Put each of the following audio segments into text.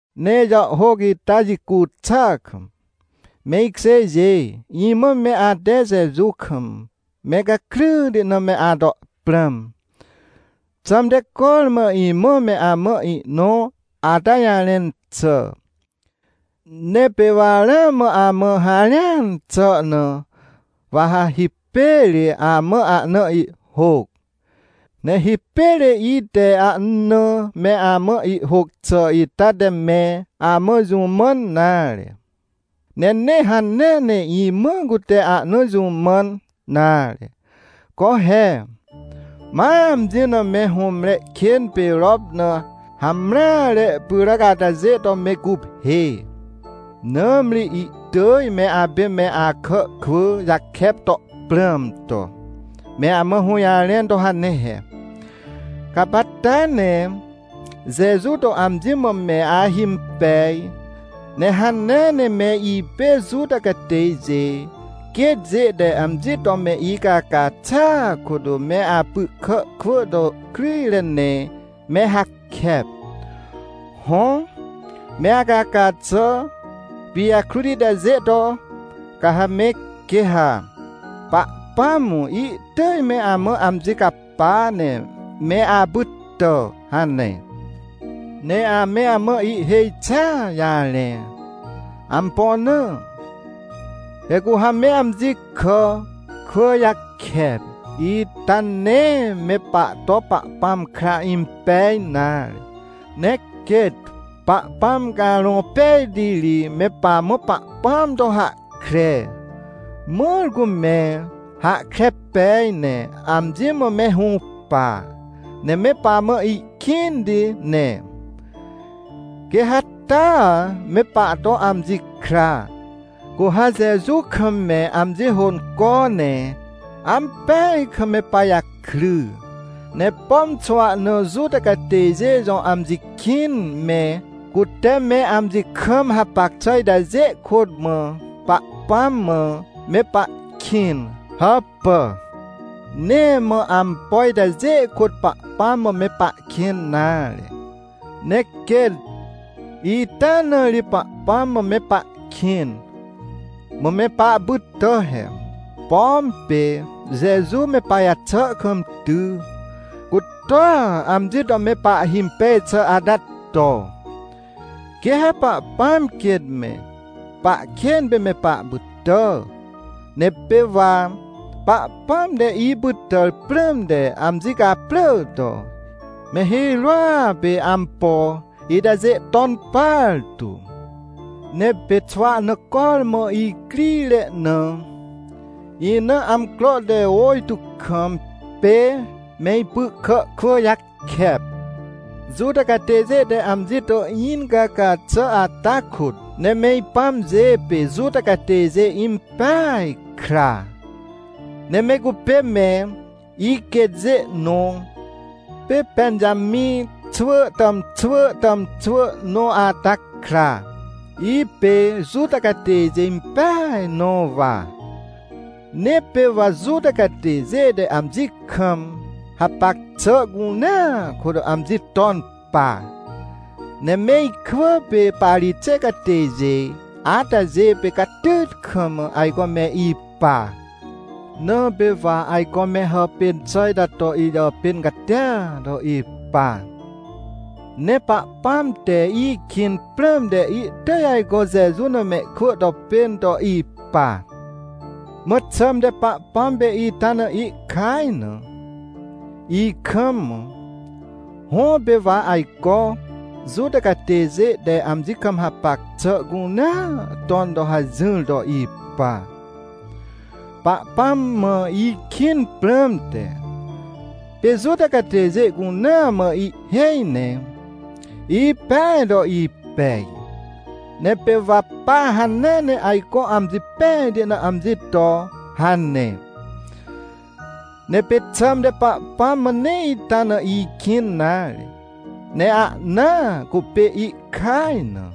Ne ijàhhôc ita jicu xà kam, me ikjêjê, imã me ate Jeju kam me gakryti na me ato prãm. Xãmte, cormã imã me amã ihnõ ata jarẽn xà. Ne pê wa ramã amã harẽan xà na, wa ha hipêr amã ahna ihhôc. Ne hipêr ite ahna me amã ihhôc xà ita te me amã jũ mãn nare, ne nee hanea ne imã cute ahna jũ mãn nare. Co he! Ma amji na me hũmre kên pê rop na hamreare pyràc atajê to me guphê! Nãmri ihtỳj me apê me akà kwỳ jakep to prãm to, me amã hũjarẽn to hane he: — Gapacta ne Jeju to amji mã me ahimpej, ne hanea ne me ipê Juta catêjê quêtjê te amji to me icaca xàa kôt me apy kà kwỳ to kryjre ne me hakep. Hõ, me acaca xà pijakrut itajê to, ca ha me, quê ha Pahpãm ihtỳj me amã amji capa ne me apytà — hane. Ne ame amã ihhêj xia jarẽ. Ampo na? He cu ha me amji kà kwỳ jakep ita nee me pahto Pahpãm kra impej nare. Ne quêt Pahpãm Carõ Pejti ri me pamã Pahpãm to hahkre, mãr cu me hahkre pej ne amji mã me hũpa, ne me pamã ihkĩnti ne, quê ha taa me pahto amji kra, cu ha Jeju kam me amji hônco ne ampeaj kam me pajakry. Ne pom xwahna Juta catêjê jõ amji kĩn me, cute me amji kam hapac xà itajê kôt mã Pahpãm mã me pahkĩn. Hãpà! Nee mã ampo itajê kôt Pahpãm mã me pahkĩn nare. Ne quêt ita na ri Pahpãm mã me pahkĩn, mã me pahpytà he. Pom pê Jeju me pajaxà kam ty, cu toa amji to me pahhimpej xà ata to, quê ha Pahpãm quêt me pahkên pê me pahpytà. Ne pê wa Pahpãm te ipytàr prãmte, amji caprỳ to, me hirôa pê ampo itajê ton partu. Ne pê xwahna cormã icrire na, ina amcro te ôjtô kam, pê me ipy kà kwỳ jakep, Juta catêjê te amji to incaca xà ata kôt. Ne me ipãmjê pê Juta catêjê impeaj kra, ne me cupê me iquêtjê nõ, pê Pẽnjamĩ xwỳ tàmxwỳ tàmxwỳ nõ ata kra. Ipê Juta catêjê impeaj nõ wa. Ne pê wa Juta catêjê te amji kam hapac xà cunea kôt amji ton pa. Ne me ikwỳ pê Parixêw catêjê atajê pê catyt kam ajco me ipa. Na pê wa ajco me hàpên xà ita to ijàpên catia to ipa. Ne Pahpãm te ikĩn prãmte itỳj ajco Jeju na mehkwỳ to pên to ipa. Mã xãmte Pahpãm pê ita na ihkaj na, ikam. Hõ, pê wa ajco Juta catêjê te amji kam hapac xà cunea ton to hajỹr to ipa, Pahpãm mã ikĩn prãmte. Pê Juta catêjê cunea mã ihhêj ne ipeaj to ipej. Ne pê wa pa hanea ne ajco amji pejti na amji to hane. Ne pê xãmte Pahpãm mã nee ita na ikĩn nare, ne ahna cupê ihkaj na.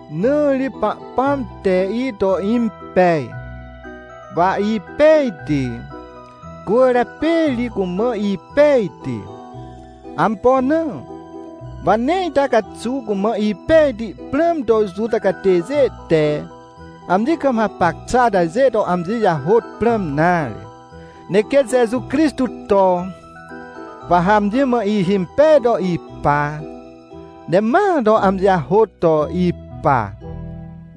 Na ri Pahpãm te ito impej, wa ipejti, cwỳrjapê ri cumã ipejti. Ampo na? Wa nee ita caxuw cumã ipejti prãm to Juta catêjê te amji kam hapac xà atajê to amji jahôt prãm nare. Ne quêt Jeju Crixtô to, wa ha amji mã ihimpej to ipa, ne ma to amji jahôt to ipa.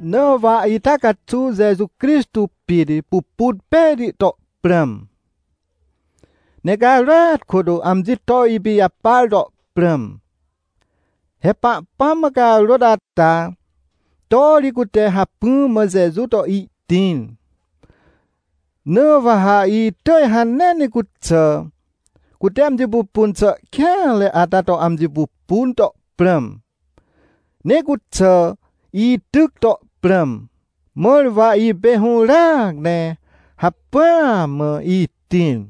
Na wa ita caxuw Jeju Crixtô pit pupun pejti to prãm, ne carôat kôt amji to ipijapar to prãm. He Pahpãm mã carôt ata to ri cute hacpỹa mã Jeju to ihtĩr. Na wa ha itỳj hanea ne cuxà, cute amji pupun xà kêanre ata to amji pupun to prãm, ne cuxà ityc to prãm, mãr wa ipê hũràac ne hacpỹa mã itĩr.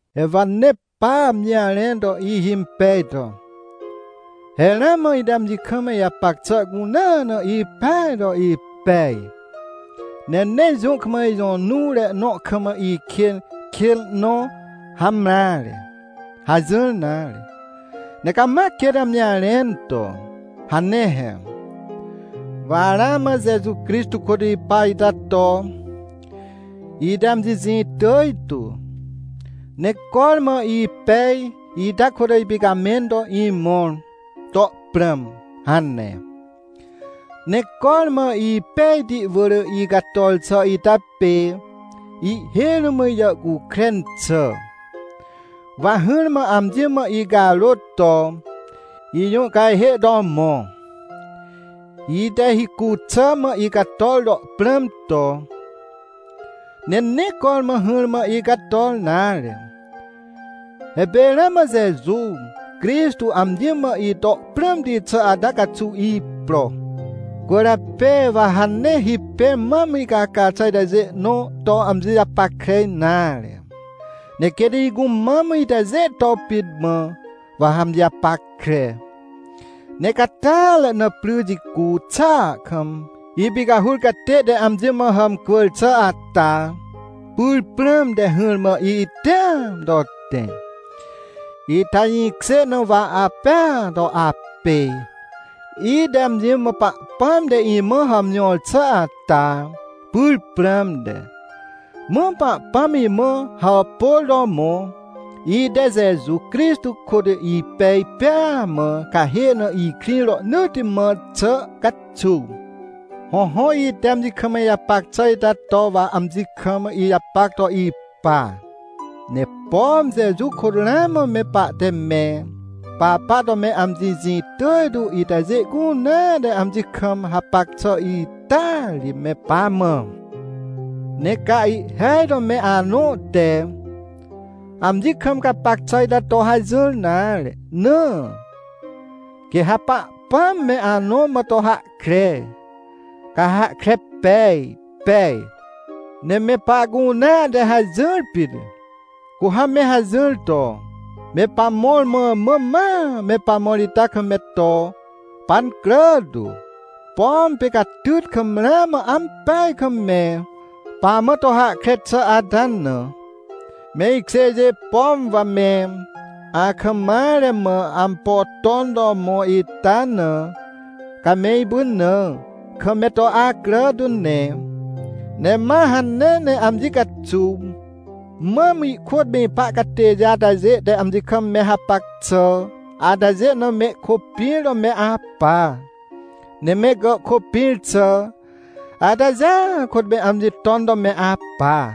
He wa nee pa amji jarẽn to ihimpej to: — He ramã ite amji kam ijapac xà cunea na ipeaj to ipej, ne nee jũ kam ijõ nuwre nõ kam, ikên kênre nõ hamreare — hajỹr nare. Ne cama quêt amji jarẽn to hane he: — Wa ramã Jeju Crixtô kôt ipa ita to, ite amji jĩ tỳj tu, ne cormã ipej ita kôt ipicamẽn to imõr to prãm — hane. Ne cormã ipejti wỳr icator xà ita pê ihhêj rũm ijàhcukren xà, wa hỹrmã amji mã icarôt to ijũhcajhê to mõ, ite hicu xà mã icator to prãm to, ne nee cormã hỹrmã icator nare. He pê ramã Jeju Crixtô amji mã ito prãmti xà ata caxuw ipro. Cwỳrjapê wa ha nee hipêr mam icaca xà itajê nõ to amji japackre nare, ne quêt icumam itajê to pit mã, wa ha amji japackre. Ne icatàatre na, pry jicu xàa kam ipicahur catê te amji mã hàmcwỳr xà ata pyr prãmte, hỹrmã ihtẽam to tẽ. Ita jĩkjê na wa apêa to apê, ite amji mã Pahpãm te imã hàmjõr xà ata pyr prãmte. Mã Pahpãm imã hàpôr to mõ, ite Jeju Crixtô kôt ipej pêa mã, cahê na ikrĩ rohnỳtti mã xà caxuw. Hõhõ, ite amji kam ijapac xà ita to wa amji kam ijapac to ipa. Ne pom Jeju kôt ramã me pahte me papa to me amji jĩ tỳj tu itajê cunea te amji kam hapac xà ita ri me pamã. Ne ca ihhêaj to me anõ te amji kam gapac xà ita to hajỹr nare na, quê ha Pahpãam me anõ mã to hahkre, ca ha hahkre pej pej. Ne me pahcunea te hajỹr pit, cu ha me hajỹr to me pamõr mã mã, ma me pamõr ita kam me to pancrà tu. Pom pê catyt kam ramã ampeaj kam me pamã to hahkre xà ata na. Me ikjêjê, pom wa me akam mare mã ampo ton to mõ ita na, ca me ipynãr kam me to acrà tu ne. Ne ma hanea ne amji caxuw mam ikôt me ipa catêjê atajê te amji kam me hapac xà atajê na mehkôpĩr to me apa, ne me gàhkôpĩr xà atajêa kôt me amji ton to me apa.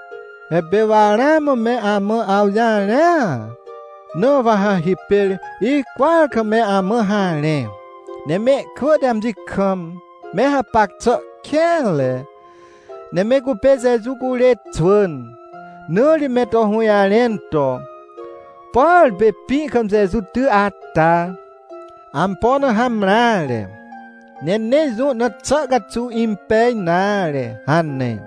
He pê wa ramã me amã awjarẽa, na wa ha hipêr icwỳar kam me amã harẽ. Ne mehkwỳ te amji kam me hapac xà kêanre, ne me cupê Jeju curê xwỳn, na ri me to hũjarẽn to: — Por pê pĩ kam Jeju ty ata, ampo na hamreare, ne nee jũ na xà caxuw impej nare — hane.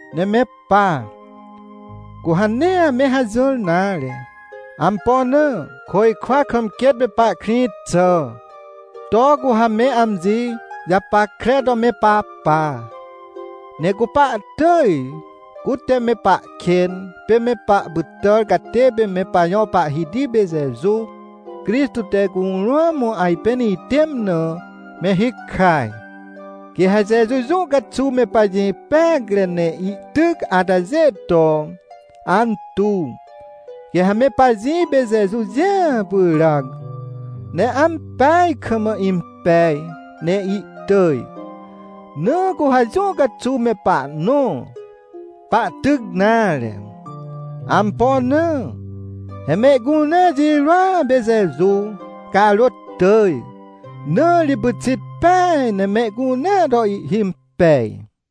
Ne me pa, cu ha nee ame hajỹr nare. Ampo na? Côjkwa kam quêt me pahkrĩ xà, to cu ha me amji japackre to me papa. Ne cu pahtỳj, cute me pahkên pê me pahpytàr catê pê me pajõ Pahhiti pê Jeju Crixtô te curũam ajpên ihtẽm na me hikaj. Quê ha Jeju jũ caxuw me pajĩ peacre, ne ihtyc atajê to antuw. Quê ha me pajĩ pê Jeju jĩa pyràc, ne ampeaj kam impej ne ihtỳj. Na cu ha jũ caxuw me pahnõ pahtyc nare. Ampo na? He mehcunea jirôa pê Jeju carôt tỳj, na ri pyxit peaj ne mehcunea to ihhimpej.